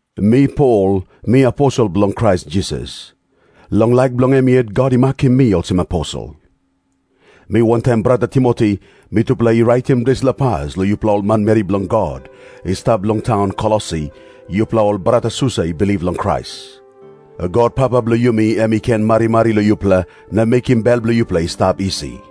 Mi Pol, mi aposel bilong Krais Jisas. Long laik bilong em yet God i makim mi olsem aposel. Mi wantaim brata Timoti mitupela i raitim dispela pas long yupela ol manmeri bilong God i stap long taun Kolosi, yupela ol bratasusa i bilip long Krais. God Papa bilong yumi em i ken marimari long yupela na mekim bel bilong yupela i stap isi.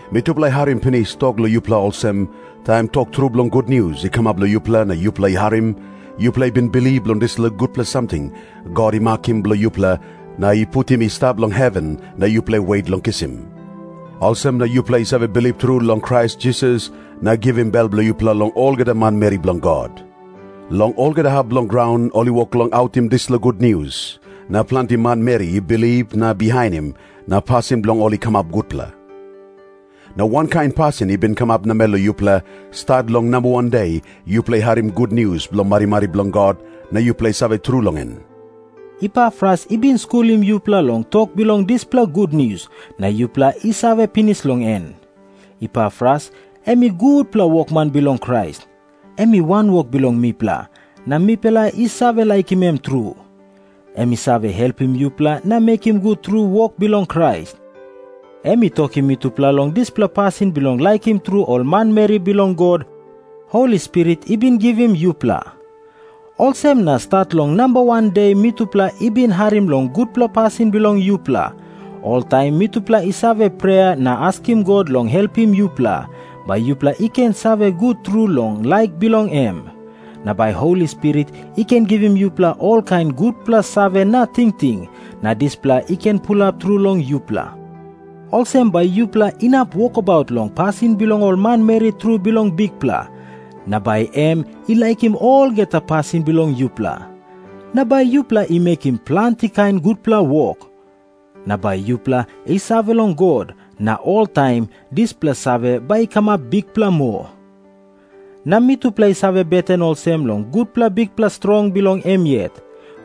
Mitupela i harim pinis tok long yupela olsem, taim tok tru bilong gutnius i kamap long yupela na yupela i harim, yupela i bin bilip long dispela gutpela samting God i makim bilong yupela na i putim i stap long heven na yupela i wet long kisim. Olsem na yupela i save bilip tru long Krais Jisas na givim bel bilong yupela long olgeta manmeri bilong God. Long olgeta hap bilong graun ol i wok long autim dispela gutnius, na planti manmeri i bilip na bihainim, na pasin bilong ol i kamap gutpela. Na wankain pasin i bin kamap namel long yupela, stat long namba wan de yupela i harim gutnius bilong marimari bilong God na yupela i save tru long en. Epafras i bin skulim yupela long tok bilong dispela gutnius, na yupela i save pinis long en. Epafras em i gutpela wokman bilong Krais. Em i wanwok bilong mipela, na mipela i save laikim em tru. Em i save helpim yupela na mekim gut tru wok bilong Krais. Em i tokim mitupela long dispela pasin bilong laikim tru ol manmeri bilong God, Holi Spirit i bin givim yupela. Olsem na stat long namba wan de mitupela i bin harim long gutpela pasin bilong yupela, oltaim mitupela i save prea na askim God long helpim yupela, bai yupela i ken save gut tru long laik bilong em. Na bai Holi Spirit i ken givim yupela olkain gutpela save na tingting, na dispela i ken pulap tru long yupela. Olsem bai yupela inap wokabaut long pasin bilong ol manmeri tru bilong Bikpela, na bai em i laikim olgeta pasin bilong yupela. Na bai yupela i mekim planti kain gutpela wok. Na bai yupela i save long God, na oltaim dispela save bai i kamap bikpela moa. Na mitupela i save beten olsem, long gutpela bikpela strong bilong em yet,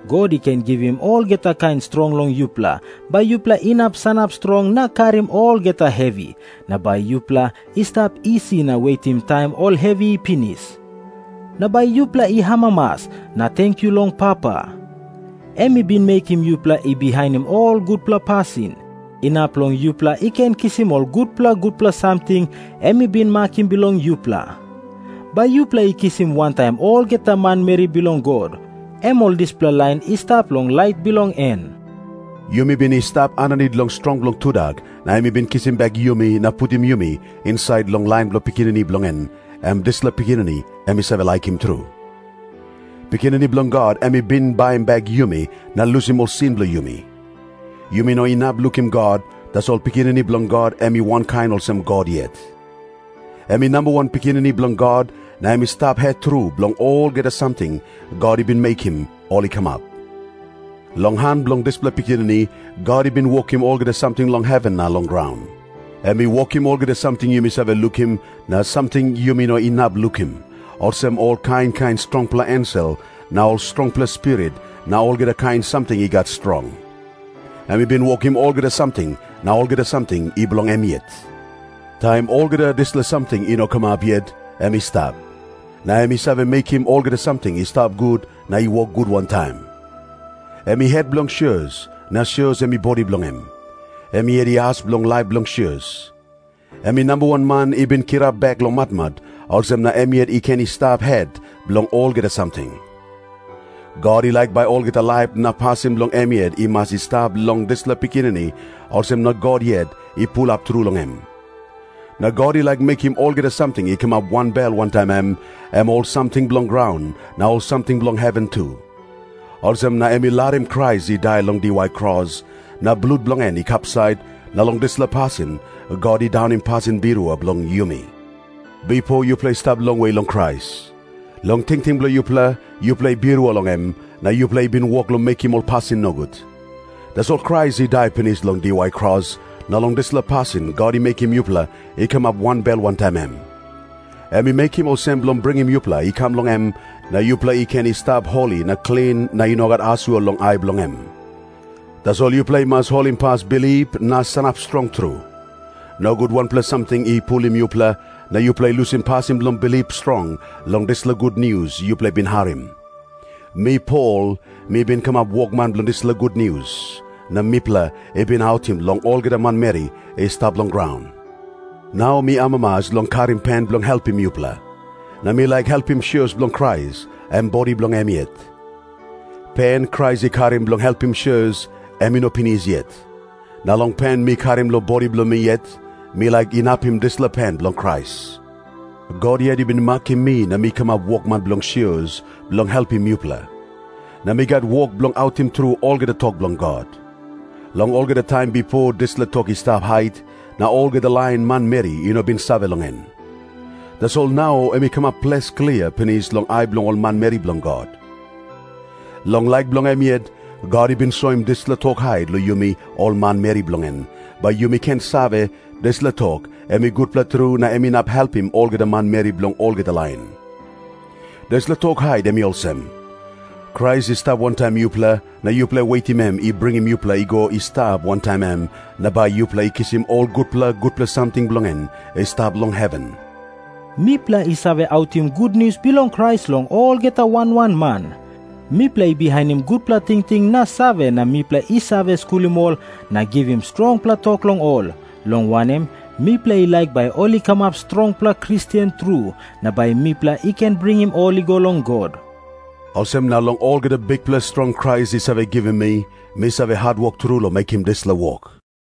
God i ken givim olgeta kain strong long yupela, bai yupela inap sanap strong na karim olgeta hevi, na bai yupela i stap isi na wetim taim ol hevi i pinis. Na bai yupela i amamas na tenkyu long Papa. Em i bin mekim yupela i bihainim ol gutpela pasin, inap long yupela i ken kisim ol gutpela gutpela samting em i bin makim bilong yupela. Bai yupela i kisim wantaim olgeta manmeri bilong God, em ol dispela lain i stap long lait bilong en. Yumi bin i stap aninit long strong bilong tudak, na em i bin kisim bek yumi na putim yumi insait long lain bilong Pikinini bilong en, em dispela Pikinini em i save laikim tru. Pikinini Bilong God em i bin baim bek yumi na lusim ol sin bilong yumi. Yumi no inap lukim God, tasol Pikinini Bilong God em i wankain olsem God yet. Em i namba wan pikinini bilong God, na em i stap het tru bilong olgeta samting God i bin mekim ol i kamap. Long han bilong dispela Pikinini, God i bin wokim olgeta samting long heven na long graun. Em i wokim olgeta samting yumi save lukim na samting yumi no inap lukim, olsem ol kain kain strongpela ensel na ol strongpela spirit na olgeta kain samting i gat strong. Em i bin wokim olgeta samting, na olgeta samting i bilong em yet. Taim olgeta dispela samting i no kamap yet, em i stap. Na em i save mekim olgeta samting i stap gut na i wok gut wantaim. Em i het bilong sios, na sios em i bodi bilong em. Em yet i as bilong laip bilong sios. Em i namba wan man i bin kirap bek long matmat, olsem na em yet i ken i stap het bilong olgeta samting. God i laik bai olgeta laip na pasin bilong em yet i mas i stap long dispela Pikinini, olsem na God yet i pulap tru long em. Na God i laik mekim olgeta samting i kamap wanbel wantaim em, em ol samting bilong graun na ol samting bilong heven tu. Olsem na em i larim Krais i dai long diwai kros, na blut bilong en i kapsait, na long dispela pasin God i daunim pasin birua bilong yumi. Bipo yupela i stap longwe long Krais. Long tingting bilong yupela, yupela i birua long em, na yupela i bin wok long mekim ol pasin nogut. Tasol Krais i dai pinis long diwai kros, na long dispela pasin God i mekim yupela i kamap wanbel wantaim em. Em i mekim olsem bilong bringim yupela i kam long em, na yupela i ken i stap holi na klin na i no gat asua long ai bilong em. Tasol yupela i mas holimpas bilip na sanap strong tru. Nogut wanpela samting i pulim yupela, na yupela i lusim pasin bilong bilip strong long dispela gutnius yupela i bin harim. Mi Pol mi bin kamap wokman bilong dispela gutnius, na mipela i bin autim long olgeta manmeri i stap long graun. Nau mi amamas long karim pen bilong helpim yupela. Na mi laik helpim sios bilong Krais, em bodi bilong em yet. Pen Krais i karim bilong helpim sios, em i no pinis yet. Na long pen mi karim long bodi bilong mi yet, mi laik inapim dispela pen bilong Krais. God yet i bin makim mi na mi kamap wokman bilong sios, bilong helpim yupela. Na mi gat wok bilong autim tru olgeta tok bilong God. Long olgeta taim bipo dispela tok i stap hait, na olgeta lain manmeri i no bin save long en. Tasol nau em i kamap ples klia pinis long ai bilong ol manmeri bilong God. Long laik bilong em yet, God i bin soim dispela tok hait long yumi ol manmeri bilong en, bai yumi ken save, dispela tok em i gutpela tru na em inap helpim olgeta manmeri bilong olgeta lain. Dispela tok hait em i olsem. Krais i stap wantaim yupela, na yupela i wetim em i bringim yupela i go i stap wantaim em na bai yupela i kisim ol gutpela gutpela samting bilong en i stap long heven. Mipela i save autim gutnius bilong Krais long olgeta wan wan man. Mipela i bihainim gutpela tingting na save na mipela i save skulim ol na givim strongpela tok long ol, long wanem, mipela i laik bai ol i kamap strongpela Kristen tru na bai mipela i ken bringim ol i go long God. Olsem na long olgeta bikpela strong Krais i save givim mi, mi save hatwok tru long mekim dispela wok.